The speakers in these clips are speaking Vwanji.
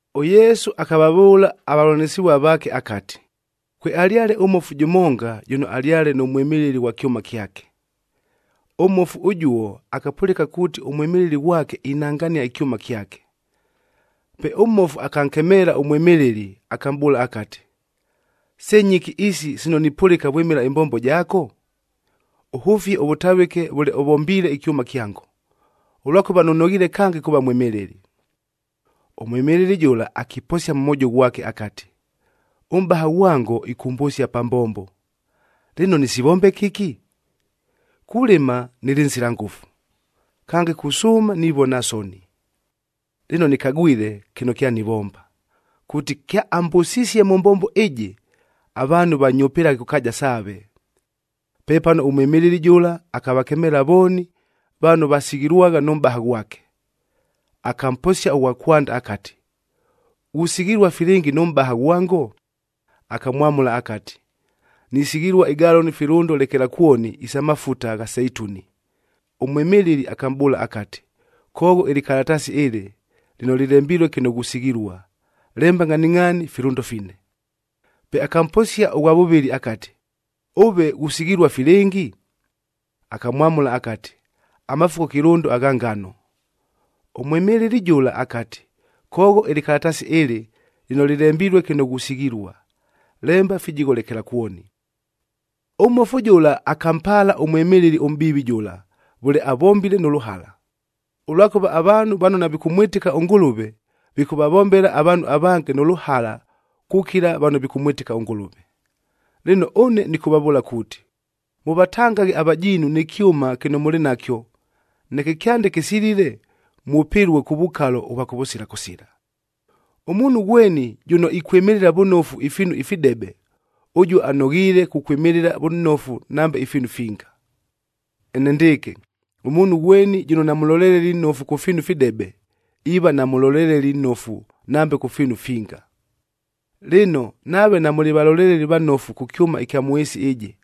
ɄYesu akavavʉʉla avavʉlanɨsɨvua vaake akati, “Kwealyale ʉmmofu jʉmonga, jʉno alyale nʉ mwɨmɨlɨli ghwa kyʉma kyake. Ʉmmofu ʉjuo akapʉlɨka kuuti ʉmwɨmɨlɨli ghwake inangania ɨkyʉma kyake. Pe ʉmmofu akankemeela ʉmwɨmɨlɨli, akamʼbʉʉla akati, ‘Se nyɨki isi sino nipʉlɨka vwɨmɨla ɨmbombo jaako? Ʉhʉfie ʉvʉtavɨke vʉle ʉvombiile ɨkyʉma kyango, ʉlwakʉva nʉnoghiile kange kuuva mwɨmɨlɨli!’ “Ʉmwɨmɨlɨli jʉla akiposia mʉ mwojo ghwake akati, ‘Ʉmʼbaha ghwango, ɨkʉmbʉsia pa mbombo, lɨno nɨsivombe kɨki? Kulɨma, nɨlɨ nsila ngʉfu. Kange, kusʉʉma nivona soni. Lɨno, nɨkagwile kɨno kyanivomba, kuuti kyaambʉsisie mʉ mbombo ɨjɨ, avaanhu vanyʉpɨlaghe kʉ kaaja saave.’ “Pepano ʉmwɨmɨlɨli jʉla akavakemeela vooni, vano vasighilwagha nʉ mʼbaha ghwake. Akamposia ʉghwa kwanda akati, ‘Ghusighilua filɨngi nʉ mʼbaha ghwango?’ Akamwamʉla akati, ‘Nisighilua igaloni filʉndo lekelakwoni isa mafuta gha seituni.’ Ʉmwɨmɨlɨli akamʼbʉʉla akati, ‘Koogho ɨlɨkalataasi ɨlɨ, lɨno lɨlembilue kɨno ghusighilua, lemba ngʼhaningʼhaani filʉndo fine.’ Pe akamposia ʉghwa vʉvɨlɨ akati, ‘Ʉve ghusighilua filɨngi?’ Akamwamʉla akati, ‘Amafuko kɨlʉndo agha ngano.’ Ʉmwɨmɨlɨli jʉla akati, ‘Koogho ɨlɨkalataasi ɨlɨ, lɨno lɨlembilue kɨno ghusighilua, lemba fijigho lekelakwoni.’ “Ʉmmofu jʉla akampaala ʉmwɨmɨlɨli ʉmʼbiivi jʉla, vʉle avombile nʉ lʉhala. Ʉlwakʉva, avaanhu vano navikʉmwɨtɨka ʉNgʉlʉve, vikʉvavombela avaanhu avange nʉ lʉhala kukila vano vikʉmwɨtɨka ʉNgʉlʉve. Lɨno, ʉne nɨkʉvavʉʉla kuuti, mʉvatangaghe avajiinu nɨ kyʉma kɨno mʉlɨ nakyo, neke kyande kɨsilile, mwʉpɨlue kʉ vukalo ʉvwa kʉvʉsila kʉsila. “Ʉmuunhu ghweni jʉno ikwɨmɨlɨla vʉnofu ifiinu ifidebe, ʉjuo anoghiile kukwɨmɨlɨla vʉnofu nambe ifiinu finga. Enendɨɨkɨ, ʉmuunhu ghweni jʉno namʉloleleli nnofu kʉ fiinu ifidebe, iiva namʉloleleli nnofu nambe kʉ fiinu ifinga. Lɨno, nave namʉlɨ valoleleli vanofu kʉ kyʉma ɨkya mʉ ɨɨsi ɨjɨ,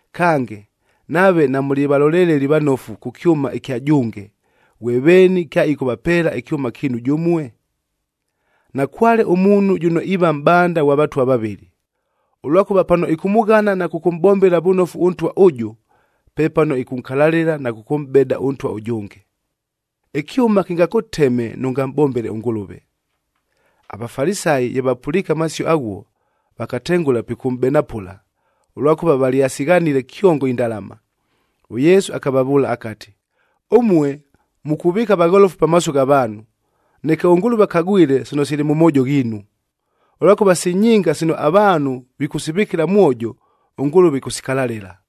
Kange, nave namʉlɨ valoleleli vanofu kʉ kyʉma ɨkya jʉnge, ghwe veeni kyaɨkʉvapeela ɨkyʉma kiinu jʉmue? Nakwale ʉmuunhu jʉno iiva mʼbanda ghwa vatwa vavɨlɨ. Ʉlwakʉva pano ɨkʉmʉghana na kʉkʉmʼbombela vʉnofu ʉntwa ʉjʉ, pepano ɨkʉnkalalɨla na kʉkʉmʼbeda ʉntwa ʉjʉnge. Ɨkyʉma kɨngakʉteme nʉngamʼbombele ʉNgʉlʉve!” AVafalisayi ye vapʉliike amasio aghuo, vakatengʉla pikʉmʼbenapʉla, ʉlwakʉva valyasighanile kyongo indalama. ɄYesu akavavʉʉla akati, “Ʉmue, mukuvɨɨka vagholofu pamaaso gha vaanhu, neke ʉNgʉlʉve akagwile sino sili mʉ moojo ghiinu. Ʉlwakʉva si nyinga sino avaanhu vikʉsivɨkɨla mwojo, ʉNgʉlʉve ɨkʉsikalalɨla!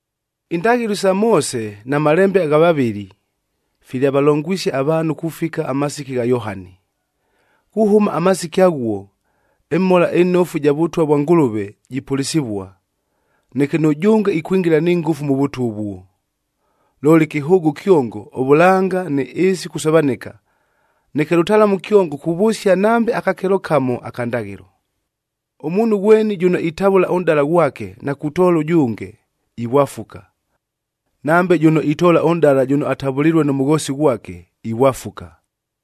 “Indaghɨlo isa Moose na malembe gha vavɨli, filyavalongwisie avaanhu kufika amasiki gha Yohani. Kuhʉma amasiki aghuo, ɨMhola ɨNofu ɨja Vʉtwa vwa Ngʉlʉve jipʉlɨsɨvua, neke nʉjʉnge ikwingila ni ngʉfu mʉ Vʉtwa ʉvuo. Looli kɨhʉʉgʉ kyongo ʉvʉlanga nɨ ɨɨsi kusovanɨka, neke lʉtalamu kyongo kuvʉsia nambe akakelo kamo aka ndaghɨlo. “Ʉmuunhu ghweni jʉno itavʉla ʉnʼdala ghwake na kutoola ʉjʉnge, ivwafuka. Nambe jʉno itoola ʉnʼdala jʉno atavʉlilue nʉ mʉghoosi ghwake, ivwafuka.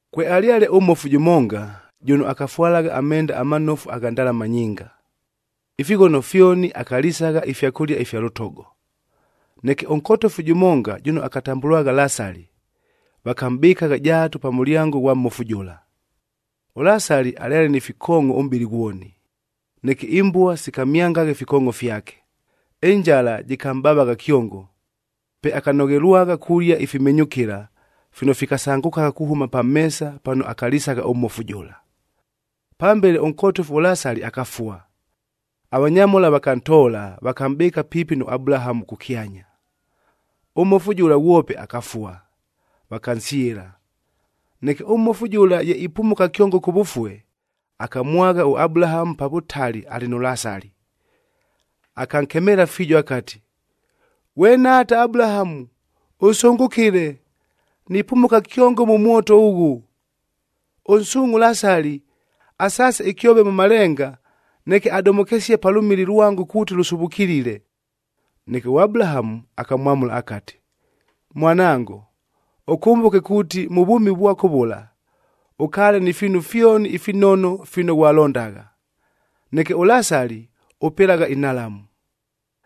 “Kwealyale ʉmmofu jʉmonga, jʉno akafwalagha amenda amanofu agha ndalama nyinga. Ifighono fyoni akalisagha ifyakʉlia ifya lʉtogo. Neke ʉnkotofu jʉmonga, jʉno akatambʉlwagha Lasali, vakamʼbɨkagha jaatu pa mʉlyango ghwa mmofu jʉla. ɄLasali alyale ni fikoongʼo ʉmʼbɨlɨ ghwoni, neke imbua sikamyangagha ifikoongʼo fyake. Ɨnjala jɨkamʼbavagha kyongo, pe akanoghelwagha kulia ifimenyʉkɨla, fino fikasangʉkagha kuhʉma pa meesa pano akalisagha ʉmmofu jʉla. “Pambele, ʉnkotofu ʉLasali akafua. Avanyamhola vakantoola, vakamʼbɨɨka piipi nʉ Abulahamu kʉkyanya. Ʉmmofu jʉla, ghwope akafua, vakansyɨla. Neke ʉmmofu jʉla ye ipumuka kyongo kʉvʉfue, akamwagha ʉAbulahamu pa vʉtali alɨ nʉ Lasali. Akankemeela fiijo akati, ‘Ghwe nhaata Abulahamu, ʉsʉngʉkɨle! Nipumuka kyongo mʉ mwoto ʉghʉ! Ʉnsuungʼhe ʉLasali, asaase ɨkyove mʉ malenga, neke adomokesie pa lʉmili lwango kuuti lʉsuvukilile.’ “Neke ʉAbulahamu akamwamʉla akati, ‘Mwanango, ʉkʉmbʉke kuuti mʉ vwʉmi vwako vʉla, ʉkaale ni fiinu fyoni ifinono fino ghwalondagha, neke ʉLasali, ʉpɨlagha inhalamu.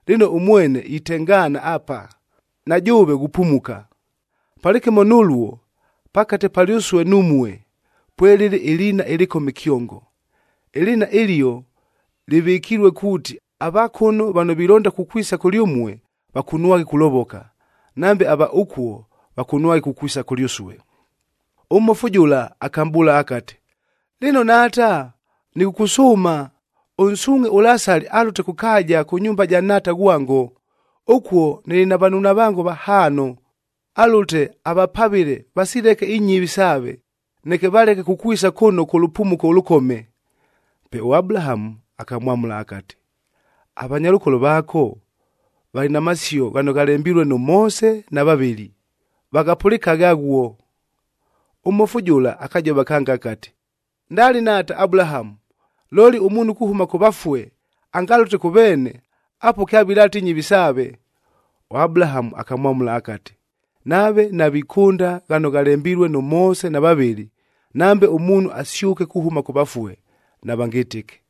Lɨno, ʉmwene itengaana apa, na jʉʉve ghupumuka. Palɨkɨmo nʉluo, pakate palyʉsue numue, pwelɨlɨ ɨliina ɨlɨkome kyongo. Ɨliina ɨlio lɨvɨkilue kuuti, ava kʉno vano vilonda kukwisa kʉlyʉmue, vakunwaghe kulovoka, nambe ava ʉkuo vakunwaghe kukwisa kʉlyʉsue.’ “Ʉmmofu jʉla akamʼbʉʉla akati, ‘Lɨno nhaata, nɨkʉkʉsʉʉma ʉnsuungʼhe ʉLasali alʉte kʉ kaaja kʉ nyumba ja nhaata ghwango. Ʉkuo nɨlɨ na vanunavango vahaano. Alʉte avapavɨle vasileke inyɨvi saave, neke valeke kukwisa kʉno kʉ lʉpumuko ʉlʉkome.’ Pe ʉAbulahamu akamwamʉla akati, ‘Avanyalʉkolo vaako, valɨ na masio ghano ghalembilue nʉ Moose na vavɨli, vaghapʉlɨkaghe aghuo!’ “Ʉmmofu jʉla akajova kange akati, ‘Ndali, nhaata Abulahamu! Looli, ʉmuunhu kuhʉma kʉ vafue angalʉte kʉ veene, apuo kyavilaata inyɨvi saave.’ ɄAbulahamu akamwamʉla akati, ‘Nave navikʉnda ghano ghalembilue nʉ Moose na vavɨli, nambe ʉmuunhu asyʉke kuhʉma kʉ vafue, navangɨtɨke.’”